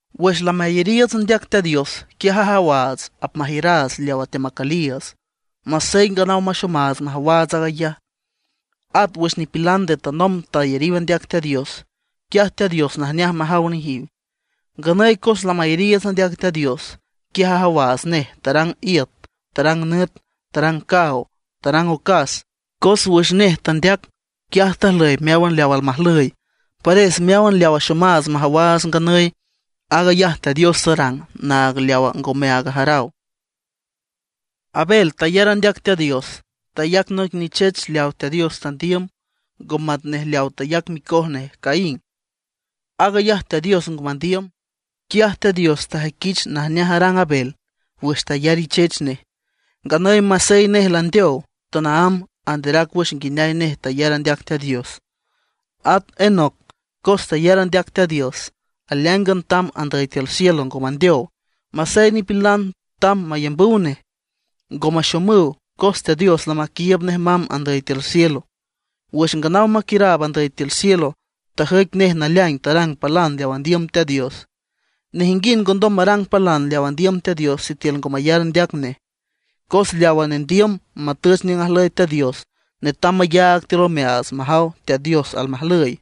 Wüx lamayariiüts andeac Teat Dios, quiaj ajawaats apmajiüraats leawa teamacüliiüts, masey nganaw maxomaats majawaats aag ayaj. At wüx nipilan nde tanomb tayariw andeac Teat Dios, quiaj Teat Dios najneaj majaw nejiw. Nganüy cos lamayariiüts andeac Teat Dios, quiaj ajawaats nej tarang iüt, tarang nüt, tarang caaw, tarang ocas; cos wüx nej tandeac quiaj tajlüy meáwan leaw almajlüy. Pares meáwan leaw axomaats majawaats nganüy, aag ayaj Teat Dios tarang naag leawa ngomeaag ajaraw. Abel tayar andeac Teat Dios, tayac noic nichech leawa Teat Dios tandiüm, ngo matnej leawa tayac micoj nej Caín; aag ayaj Teat Dios ngo mandiüm. Quiaj Teat Dios tajüiquich najneaj arang Abel wüx tayar ichech nej. Nganüy masey nej landeow, tanaámb anderac wüx nguineay nej tayar andeac Teat Dios. At Enoc, cos tayar andeac Teat Dios, aleáingan tamb andüy tiül cielo, ngo mandeow. Masey nipilan tamb mayambüw nej, ngo maxomüw, cos Teat Dios lamaquiiüb nej mamb andüy tiül cielo. Wüx nganaw maquiüraab andüy tiül cielo, tajüic nej naleaing tarang palan leawa andiüm Teat Dios. Nejinguind ngondom marang palan leaw andiüm Teat Dios sitiül ngo mayar andeac nej. Cos leawa nendiüm matüch niüng ajlüy Teat Dios, netam mayaag tiül omeaats, majaw Teat Dios almajlüy.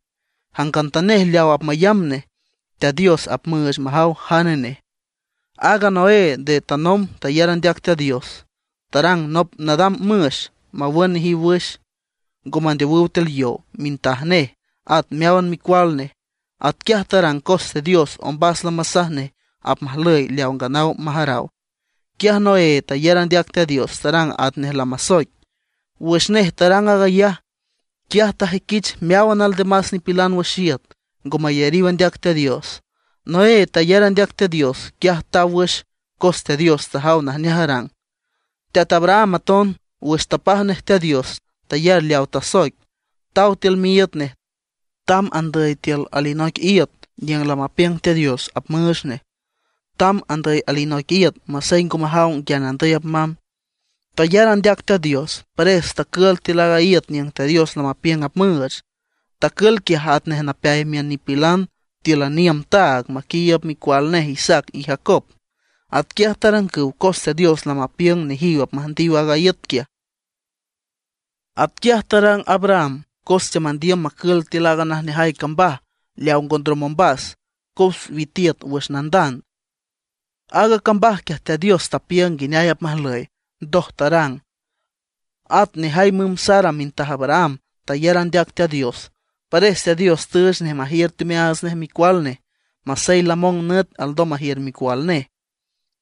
Jangantanej leaw apmayamb nej, Teat Dios apmüüch majaw jane nej. Aaga Noé nde tanomb tayar andeac Teat Dios, tarang nop nadam müx mawün nejiw wüx, ngo mandeowüw tiül yow mintaj nej, at meáwan micual nej. Atquiaj tarang cos Teat Dios ombas lamasaj nej apmajlüy leaw nganaw majaraw. Quiaj Noé tayar andeac Teat Dios, tarang atnej lamasoic. Wüx nej tarang aag ayaj, quiaj tajüiquich meáwan aldemas nipilan wüx iüt ngo mayariw andeac Teat Dios. Noé tayar andeac Teat Dios, quiaj taw wüx cos Teat Dios tajaw najneaj arang. Teat Abraham aton, wüx tapaj nej Teat Dios, tayar leawa tasoic; taw tiül miíüt nej, tamb andüy tiül alinoic iüt niüng lamapiüng Teat Dios apmüüch nej. Tamb andüy alinoic iüt masey ngo majaw nguiane andüy apmamb. Tayar andeac Teat Dios, pares tacül tiül aaga iüt niüng Teat Dios lamapiüng apmüüch. Tacül quiaj atnej napeay miün nipilan tíülan iüm taag maquiiüb micual nej Isaac y Jacob. Atquiaj tarangüw cos Teat Dios lamapiüng nejiw apmüjndiw aaga iüt quiaj. Atquiaj tarang Abraham cos teamandiüm macül tiül aaga najneajay cambaj leaw ngo ndrom ombas cos witiüt wüx leawa nandand. Aaga cambaj quiaj Teat Dios tapiüng nguineay apmajlüy, ndoj tarang. At nejay müm Sara mintaj Abraham, tayar andeac Teat Dios; pares Teat Dios tüüch nej majiür teomeaats nej micual nej, masey lamong nüt alndom majiür micual nej.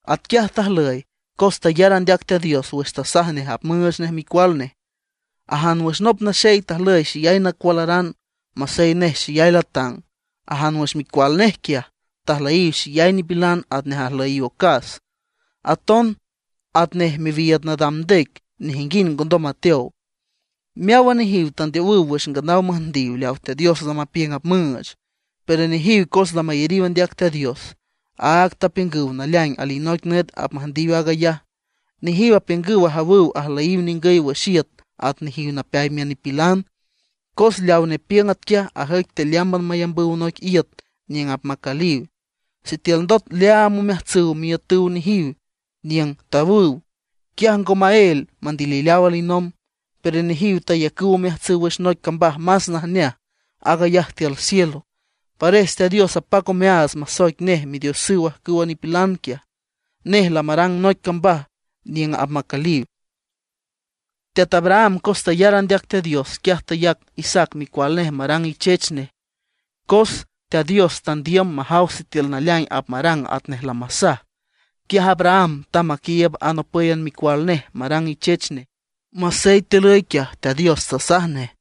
Atquiaj tajlüy, cos tayar andeac Teat Dios wüx tasaj nej apmüüch nej micual nej. Ajan wüx nop naxey tajlüy xeyay nacualaran, masey nej xeyay latang. Ajan wüx micual nej quiaj, tajlüyiw xeyay nipilan atnej ajlüyiw ocas, aton atnej miwiiüd nadam ndec, nejinguind ngondom mateow. Meáwan nejiw tandeowüw wüx nganaw müjndiw leaw Teat Dios lamapiüng apmüüch. Pero nejiw cos lamayariw andeac Teat Dios, áag tapiüngüw naleaing alinoic nüt apmüjndiw aag ayaj. Nejiw apiüngüw ajawüw ajlüyiw ningüy wüx iüt at nejiw napeay miün nipilan. Cos leaw nepiüng atquiaj ajüic tealeámban mayambüw noic iüt niüng apmacüliw. Sitiül ndot leaam omeajtsüw miiütüw nejiw niüng tawüw, quiaj ngo maél mandilileaw alinomb. Pero nejiw tayacüw omeajtsüw wüx noic cambaj más najneaj, aag ayaj tiül cielo. Pares Teat Dios apac omeaats masoic nej Midiosüw ajcüwa nipilan quiaj; nej lamarang noic cambaj niüng apmacüliw. Teat Abraham cos tayar andeac Teat Dios, quiaj tayac Isaac micual nej marang ichech nej, cos Teat Dios tandiüm majaw sitiül naleaing apmarang atnej lamasaj. Quiaj Abraham tamb maquiiüb aag anopǘyan micual nej marang ichech nej, masey tilüy quiaj Teat Dios tasaj nej: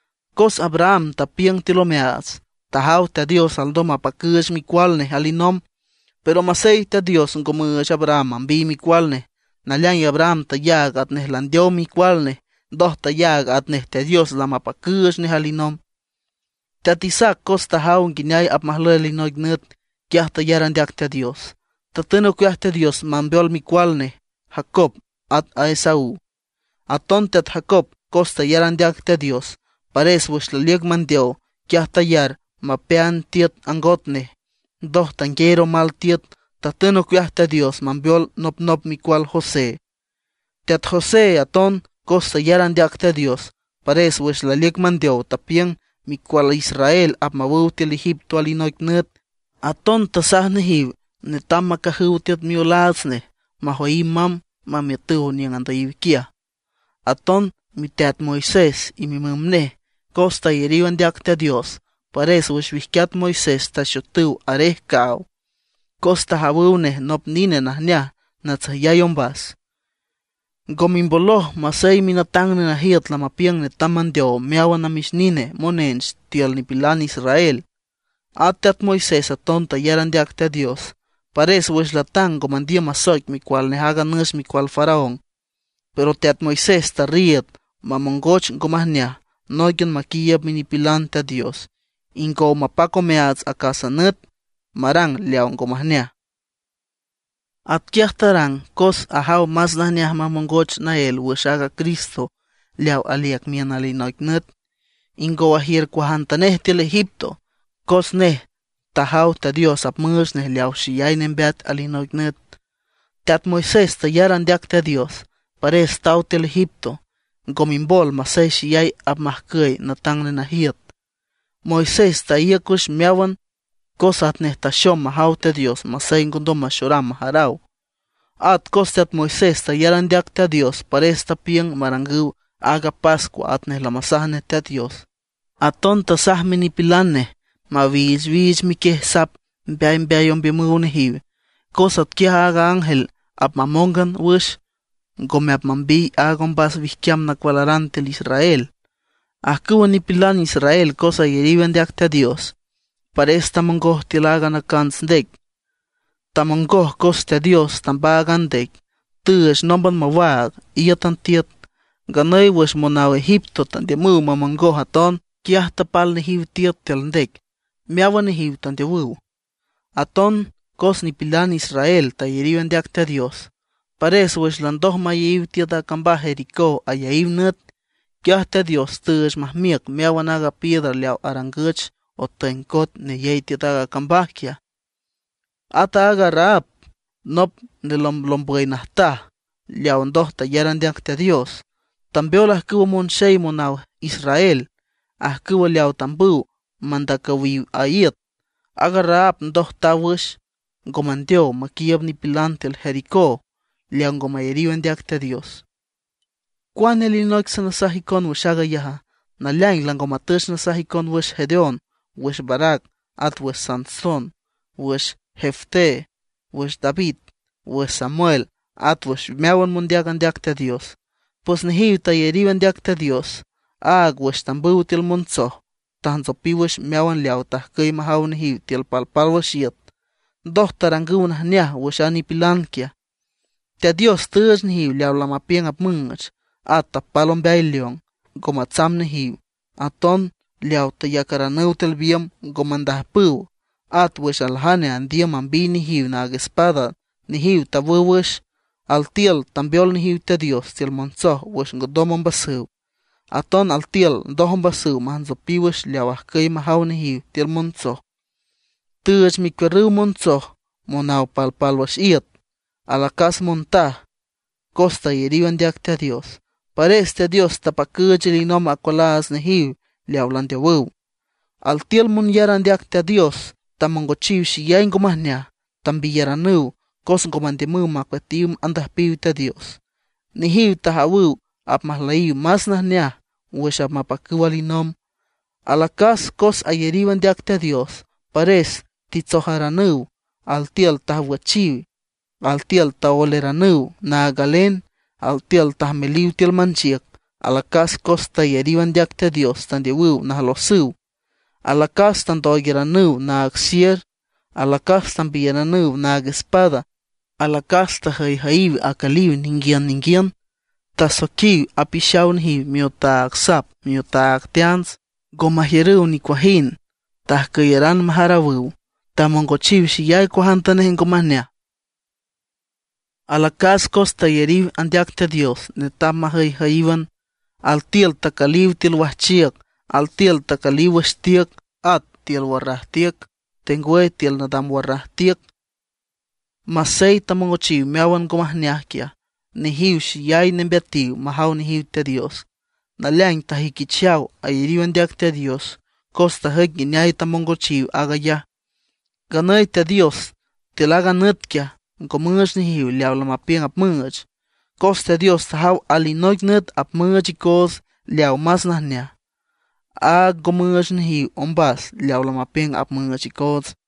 Cos Abraham tapiüng tiül omeaats, tajaw Teat Dios alndom mapacüüch micual nej alinomb. Pero masey Teat Dios ngo müüch Abraham mambiy micual nej, naleaing Abraham tayaag atnej landeow micual nej, ndoj tayaag atnej Teat Dios lamapacüüch nej alinomb. Teat Isaac cos tajaw nguineay apmajlüy alinoic nüt, quiaj tayar andeac Teat Dios, tatün ocueaj Teat Dios mambeol micual nej Jacob at a Esaú. Aton teat Jacob cos tayar andeac Teat Dios, pares wüx laliüc mandeow, quiaj tayar mapeaand tiüt angot nej, ndoj tangueer omal tiüt, tatün ocueaj Teat Dios mambeol nopnop micual José. Teat José aton cos tayar andeac Teat Dios, pares wüx laliüc mandeow tapiüng micual Israel apmawüw tiül Egipto alinoic nüt. Aton tasaj nejiw netam macajüw tiüt miolaats nej majoyiw mamb mamiütüw niüng andüyiw quiaj. Aton miteat Moisés y mimüm nej, cos tayariw andeac Teat Dios, pares wüx wijquiat Moisés taxotüw arej caaw; cos tajawüw nej nop nine najneaj natsüjyay ombas. Ngo mimboloj masey minatang nenajiüt lamapiüng netam mandeow meáwan namix nine monench tiül nipilan israel. At teat Moisés aton tayar andeac Teat Dios, pares wüx latang ngo mandiüm masoic micual nej aaga nüx micual Faraón. Pero teat Moisés tarriiüd mamongoch ngo majneaj nóiquian maquiiüb minipilan Teat Dios ingow mapac omeaats acásan nüt marang leaw ngo majneaj. Atquiaj tarang cos ajaw más najneaj mamongoch naél wüx aaga Cristo leaw aliüc miün alinoic nüt, ingow ajiür cuajantanej tiül Egipto. Cos nej tajaw Teat Dios apmüüch nej leaw xeyay nembeat alinoic nüt. Teat Moisés tayar andeac Teat Dios, pares taw tiül Egipto; ngo mimbol masey xeyay apmajcüy natang nenajiüt. Moisés taíüc wüx meáwan cos atnej taxom majaw Teat Dios masey ngondom maxoram majaraw. At cos teat Moisés tayar andeac Teat Dios, pares tapiüng marangüw aaga pascua atnej lamasaj nej Teat Dios. Aton tasaj minipilan nej mawichwich miquiej sap mbeaymbeay ombiümüw nejiw, cos atquiaj aaga ángel apmamóngan wüx, ngome apmambiy aaga ombas wijquiam nacualaran tiül israel. Ajcüwa nipilan israel cos ayariw andeac Teat Dios, pares tamongoj tiül aaga Nacants Ndec. Tamongoj cos Teat Dios tambaag a ndec, tüüch nómban mawaag, íütan tiüt. Nganüy wüx monaw Egipto tandiümüw mamongoj aton, quiaj tapal nejiw tiüt tiül ndec, meáwan nejiw tandeowüw. At aton cos nipilan israel tayariw andeac Teat Dios, pares wüx landoj mayeyiw tiüt a cambaj Jericó ayaíw nüt, quiaj Teat Dios tüüch majmiüc meáwan aaga piedra leaw arangüch otüeng coet neyey tiüt aaga cambaj quiaj. At aaga Rahab, nop nelomblombüy najtaj leawa ndoj tayar andeac Teat Dios, tambeol ajcüwa monxey monaw Israel, ajcüw leaw tambüw mandacüwiw a iüt. Aaga Rahab ndoj taw wüx, ngo mandeow maquiiüb nipilan tiül Jericó leaw ngo mayariw andeac Teat Dios. ¿Cuane alinoic sanasaj icon wüx aag ayaja? Naleaing lango matüch nasaj icon wüx Gedeón, wüx Barac, wüx Sansón, wüx Jefté, wüx David, wüx Samuel, at wüx meáwan mondeac andeac Teat Dios. Pues nejiw tayariw andeac Teat Dios, áag wüx tambüw tiül montsoj tajntsopiw wüx meáwan leaw tajcüy majawüw nejiw tiül palpálwüx iüt. Ndoj tarangüw najneaj wüx a nipilan quiaj. Teat Dios tüüch nejiw leawa lamapiüng apmüüch, at tapal ombeay león, ngo matsamb nejiw. Aton leaw tayacaranüw tiül biümb, ngo mandajpüw. At wüx aljane andiüm mambiy nejiw naag espada, nejiw tawüw wüx. Altiül tambeol nejiw Teat Dios tiül montsoj wüx ngondom ombasüw. Aton altiül ndoj ombasüw majntsopiw wüx leaw ajcüy majaw nejiw tiül montsoj, tüüch mecuiürrüw montsoj monaw palpálwüx iüt. Alacas montaj, cos tayariw andeac Teat Dios, pares Teat Dios tapacüüch alinomb acualajtsüw nejiw leawa landeowüw. Altiül monyar andeac Teat Dios tamongochiw xeyay ngo majneaj; tambiyaranüw cos ngo mandiümüw macueatiw andüjpiw Teat Dios. Nejiw tajawüw apmajlüyiw más najneaj wüx apmapacüw alinomb. Alacas cos ayariw andeac Teat Dios, pares titsojaranüw. Altiül tajwüchiw, altiül taoeleranüw naag galen, altiül tajmeliw tiül manchiüc. Alacas cos tayariw andeac Teat Dios tandeowüw najlosüw; alacas tandooigaranüw naag sier; alacas tambiyaranüw naag espada. Alacas tajüyjüyiw acüliw ninguiün ninguiün, tasoijquiw apixaw nejiw miotaag sap miotaag teants, ngo majiürüw nicuajind; tajcüyaran majarawüw, tamongochiw xeyay cuajantanej ngo majneaj. Alacas cos tayariw andeac Teat Dios netam majüyjüyíwan. Altiül tacüliw tiül wajchiüc, altiül tacüliw wüx tiüc, at tiül warraj tiüc, tengwüy tiül nadam warraj iüt. Masey tamongochiw meáwan aaga ngo majneaj quiaj, nejiw xeyay nembeatiw majaw nejiw Teat Dios. Naleaing tajüiquichaw ayariw andeac Teat Dios cos tajüic nguineay tamongochiw aag ayaj. Nganüy Teat Dios tiül aaga nüt quiaj ngo müüch nejiw leaw lamapiüng apmüüch. Cos Teat Dios tajaw alinoic nüt apmüüch icoots leawa más najneaj, áag ngo müüch nejiw ombas leaw lamapiüng apmüüch icoots.